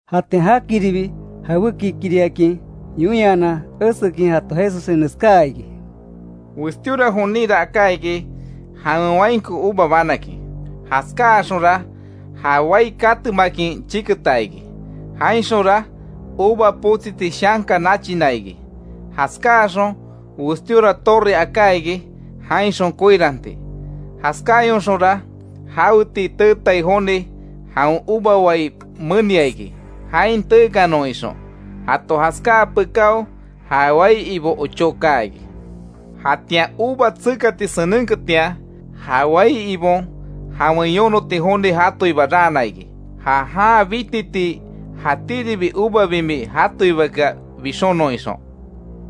Jatian jakiribi, jawékikiriakin yoinhanan esekin jato Jesussen neskaa iki: —Westíora joninra aká iki, jawen wainko uva banakin. Jaskáaxonra ja wai katemakin chiketa iki. Jainxonra uva potsiti shanka nachina iki. Jaskaáxon westíora torre aká iki jainxon koiranti. Jaskáayonxonra jaweti teetai joni, jawen uva wai menia iki, jain teekanon ixon. Jato jaskáa pekáo ja wai ibo ochó kaa iki. Jatian uva tsekati senenketian, ja wai ibon jawen yonoti joni jatoiba raana iki, ja jan bititii jatíribi uva bimi jatoibakea bixonon ixon.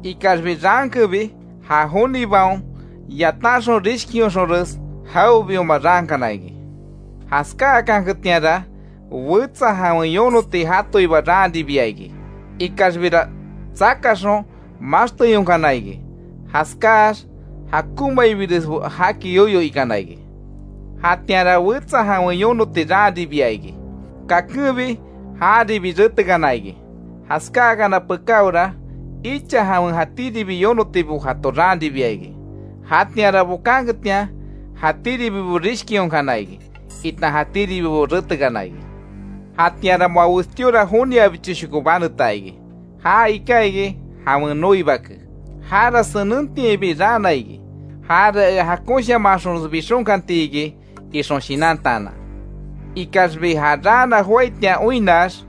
Ikaxbi raankenbi ja jonibaon yatanxon rishkionxonres, jawebioma raankana iki. Jaskáakanketianra, wetsa jawen yonoti jatoiba raanribia iki; ikaxbira tsakaxon maxteyonkana iki. Jaskáax jakonmaibiresbo jaki yoyo ikana iki. Jatianra wetsa jawen yonoti raanribia iki, kakenbi jaribi retekana iki. Jaskákana pekáora, icha jawen jatíribi yonotibo jato raanribia iki. Jatianra bokanketian, jatíribibo rishkionkana iki, itan jatíribibo retekana iki. Jatianra moa westíora joniabichoshoko baneta iki. Já iká iki, jawen noi bake. ‘Jara senentiainbi raana iki, jara ea jakonshamanxonres bixonkantiki ixon shinantaanan’. Ikaxbi ja raana joaitian oinnax,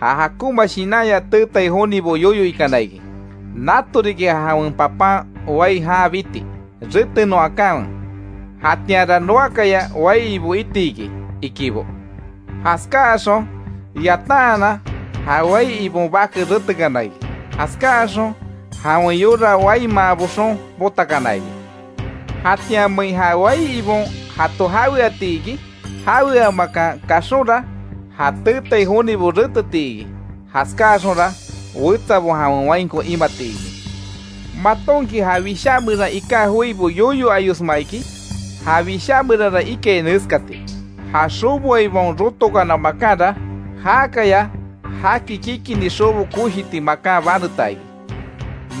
ja jakonma shinanya teetai jonibo yoyo ikana iki: ‘Nato riki ja jawen papan wai jan biti. Retenon akanwe, jatianra noakaya wai ibo iti iki’, ikibo. Jaskáxon yataanan, ja wai ibon bake retekana iki. Jaskáaxon jawen yora waimaan boxon, potakana iki. ¿Jatianmein ja wai ibon jato jaweati iki? Jaweamakan kaxonra, ja teetai jonibo reteti iki. Jaskaáxonra, wetsabo jawen wainko imati iki. ¿Matonki ja wishá meran iká joibo yoyo ayosma iki? Ja Wishá meranra ikai neskati: ‘Ja xoboaibaon, rotokana makanra, jákaya jaki kikini xobo koshiti makan baneta iki.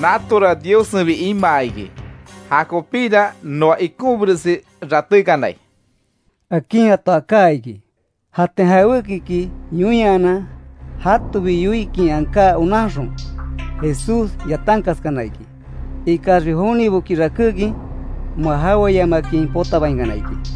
Natora Diossenbi imaa iki, jakopíra noa ikonbiresi ratékanai’ —akin jato aká iki. Jatian jawékiki yoinhanan, jatobi yoikin aká onanxon, Jesús yatankaskana iki. Ikaxbi joniboki rakékin, moa jaweayamakin potabainkana iki.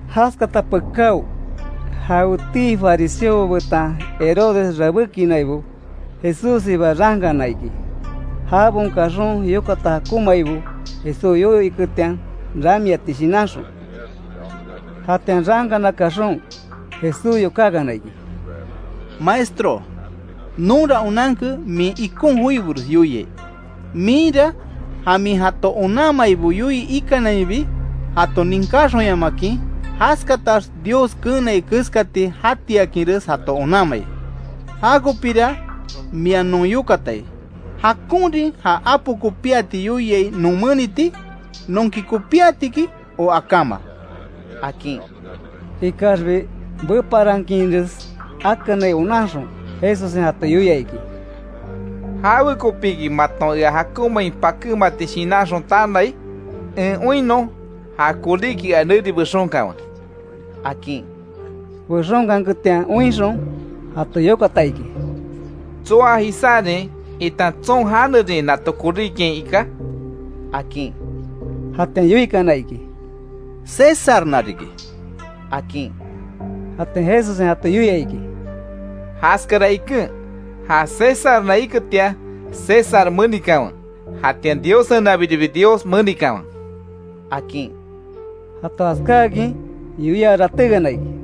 Jaskata pekáo, jawetii fariseobo betan Herodes rabékinaibo, Jesússiba raankana iki. Jabaon kaxon yokata jakonmaibo Jesús yoyo iketian, ramiati shinanxon. Jatian raankana kaxon, Jesús yokákana iki: —Maestro, nonra onanke min ikon joibores yoiai. Minra ja min jato onanmaibo yoii ikanainbi jato ninkáxonyamakin, jaskatax Dios keenai keskati jakantiakinres jato onanmai. Jakopira mia non yokatai: ¿Jakonrin ja apo kopíati yoiai non meniti? ¿Nonki kopíatiki o akáma? —akin. Ikaxbi beparankinres akanai onanxon, Jesussen jato yoia iki: —¿Jawekopiki maton ea jakonmain pakémati shinanxon tanai? En oinnon ja koríki ea neri bexonkanwe —akin. Bexonkanketian oinxon, jato yokata iki: —¿Tsoa jisárin itan tson janerin nato koríkiain iká? —akin. Jatian yoikana iki: —Césarna riki —akin. Jatian Jesussen jato yoia iki: —Jaskara iken, ja Césarna iketian César menikanwe. Jatian Diossenabiribi Dios menikanwe —akin. Jato jaskáakin yoia ratékana iki.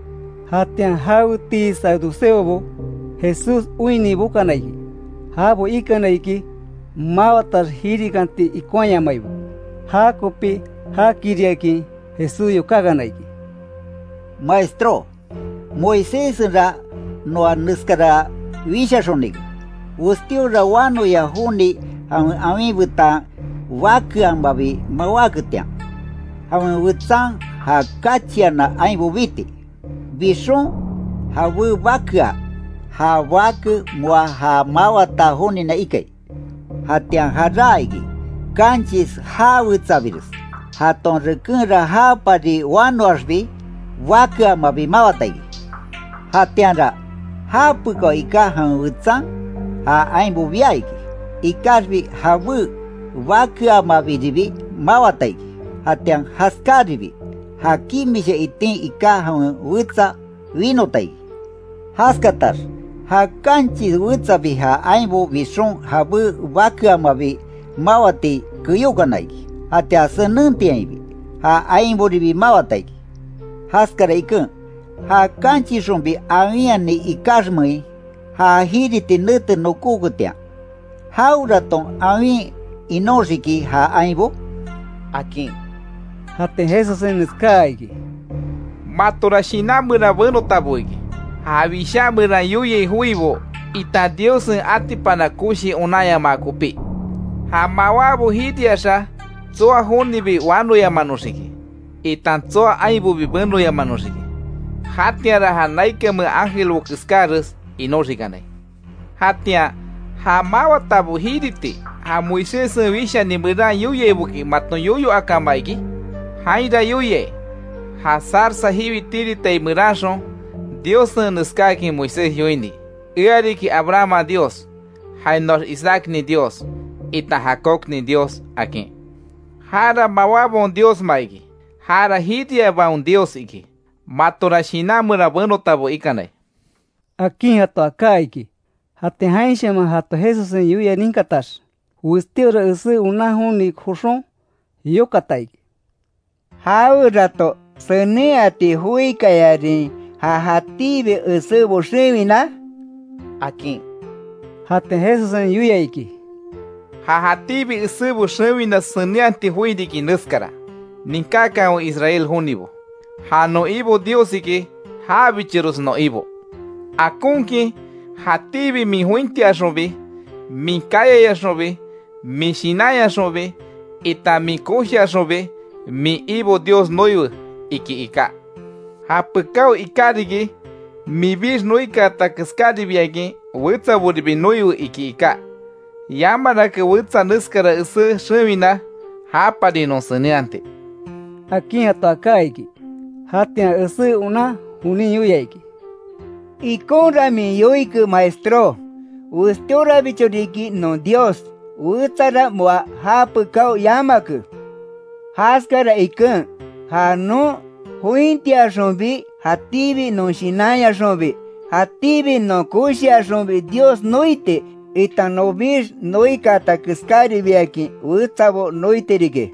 Jatian jawetii saduceobo, Jesús oinni bokana iki. Jabo ikana iki, mawatax jirikanti ikonhayamaibo. Jakopi jakiriakin Jesús yokákana iki: —Maestró, Moiséssenra noa neskara wishaxonike: Westíora wanoya joni jawen awin betan bakeamabi mawáketian, jawen wetsan ja kachiana ainbo biti. Bixon, jabé bakea, ja bake moa ja mawata jonina ikai. Jatian jaráa iki, kanchis jawetsabires. Jaton rekenra japari wanoaxbi, bakeamabi mawata iki. Jatianra, japekáo iká jawen wetsan, ja ainbo bia iki. Ikaxbi jabé bakeaamabiribi mawata iki. Jatian jaskaribi, ja kimisha itin iká jawen wetsa winota iki. Jaskatax, ja kanchis wetsabi ja ainbo bixon jabé bakeaamabi mawati keyókana iki. Jatian senentiainbi, ja ainboribi mawata iki. Jaskara iken, ja kanchisxonbi awinhani ikaxmein, ja jiriti nete nokoketian ¿Jaweraton awin inoxiki ja ainbo? —akin. Jatian Jesussen neskaa iki: —Matora shinan meran benotabo iki. Ja wishá meran yoiai joibo, itan Diossen atipana koshi onanyamaa kopí. Ja mawábo jiriaxa tsoa jonibi wanoyamanoxiki, itan tsoa ainbobi benoyamanoxiki. Jatianra ja naikanmea ángelbo keskáres inoxikanai. Jatian ¿Ja mawatabo jiriti, ja Moiséssen wishani meran yoiaiboki maton yoyo akama iki? Jainra yoiai ja zarza jiwi tiritai meranxon Diossen neskáakin Moisés yoini: ‘Ea riki, Abrahamman Dios, jainoax Isaacnin Dios, itan Jacobnin Dios’, akin. Jara mawábaon Diosma iki, jara jiriabaon Dios iki. Matora shinan meran benotabo ikanai —akin jato aká iki. Jatian jainshaman jato Jesussen yoia ninkatax, westíora esé onan joni joxon, yokata iki: —¿Jawerato senenhati joikayarin, ja jatíbi esébo xewina? —akin. Jatian Jesussen yoia iki: —Ja jatíbi esébo xewina senenhati joi riki, neskara: ‘Ninkákanwe Israel jonibo, ja non Ibo Diossiki, jabichores non Ibo. Akonkin; jatíbi min jointiaxonbi, min kayayaxonbi, min shinanyaxonbi itan min koshiaxonbi min Ibo Dios noiwe’, iki iká. Japekáo iká riki: ‘Minbix noikaata keskáribiakin, wetsaboribi noiwe’, iki iká. Yamarake wetsa neskara esé xewina, japari non senenhati —akin jato aká iki. Jatian esé onan jonin yoia iki: —Ikonra min yoike Maestró, westíorabicho riki non Dios, wetsara moa já pekao yamake. Jaskara iken, ja non jointiaxonbi, jatíbi non shinanyaxonbi, jatíbi non koshiaxonbi Dios noiti, itan nonbix noikaata keskáribiakin wetsabo noiti riki,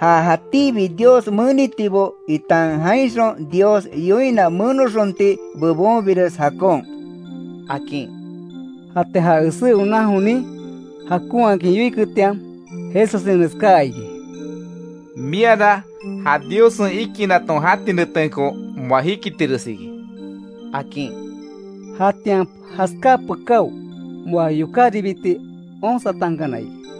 ja jatíbi Dios menitibo itan jainxon Dios yoina menoxonti bebonbires jakon —akin. Jatian ja esé onan jonin, jakonhakin yoiketian, Jesussen neskaa iki: —Miara ja Diossen ikinaton jati netenko moa jikitires iki —akin. Jatian jaskáa pekáo, moa yokáribiti onsatankana iki.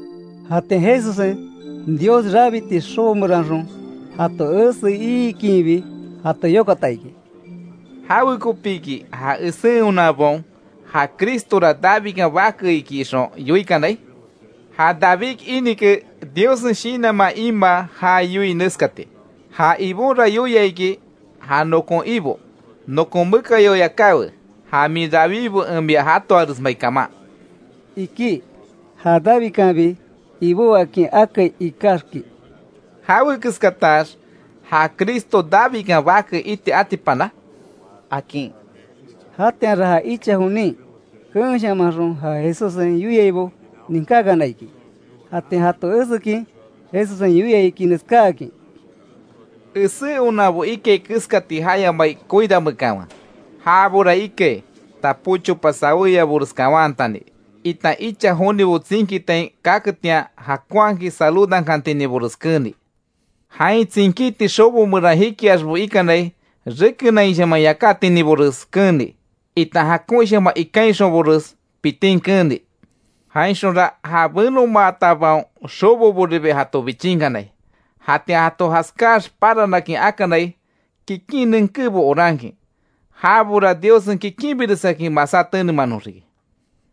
Jatian Jesussen, Dios rabiti xobo meranxon, jato esei iikinbi, jato yokata iki: —¿Jawekopiki ja esé onanbaon, ja Cristora Davidkan bake iki ixon yoikanai? Ja David inike, Diossen Shinanman imaa, já yoii neskati: ‘Ja Ibonra yoia iki, ja nokon Ibo: Nokon mekayao yakáwe, ja min rawibo en mia jatoaresmai kaman’, iki. Ja Davidkanbi, Ibó akin akai ikaxki ¿Jawe keskatax ja Cristo Davidkan bake iti atipana? —akin. Jatianra ja icha jonin, keenshamanxon ja Jesussen yoiaibo ninkákana iki. Jatian jato esekin, Jesussen yoia iki neskákin: —Esé onanbo ikai keskati jayamai koirameekanwe. Jabora ikai, tapó chopa sawéyabores kawanhatani, itan icha jonibo tsinkitain kaketian jakonhakin saludankantininbores keeni. Jain tsinkiti xobo meran jikiaxbo ikanai rekenaishaman yakátininbores keeni, itan jakonshaman ikainxonbores pitin keeni. Jainxonra ja benomaatabaon xoboboribi jato bichinkanai. Jatian jato jaskáax, paranakin akanai kikin nenkébo orankin. Jabora, Diossen kikinbiresakin, masá tenemanoxiki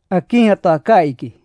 —akin jato aká iki.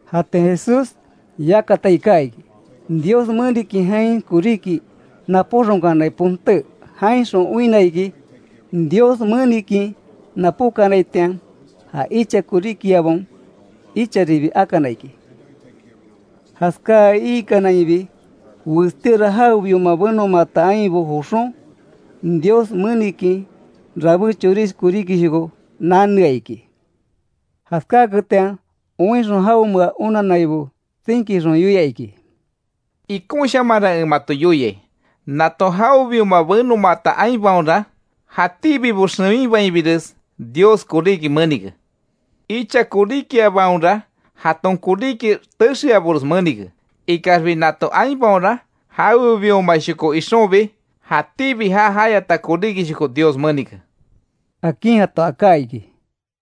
Jatian Jesús yakata iká iki, Dios menikin jain koríki napóxonkanai ponté. Jainxon oinna iki, Dios menikin napókanaitian. Ja icha koríkiabaon, icharibi akana iki. Jaskaai iikanainbi, westíora jawebioma benomaata ainbo joxon, Dios menikin rabé chorish koríkishoko nanea iki. Jaskáketian, oinxon jaonmea onannaibo tsinkixon, yoia iki: —Ikonshamanra en mato yoiai, nato jawebioma benomaata ainbaonra, jatíbibo xewinbainbires, Dios koríki menike. Icha koríkiabaonra, jaton koríki texeabores menike. Ikaxbi nato ainbaonra, jawebiomashoko ixonbi jatíbi já jayata koríkishoko Dios menike —akin jato aká iki.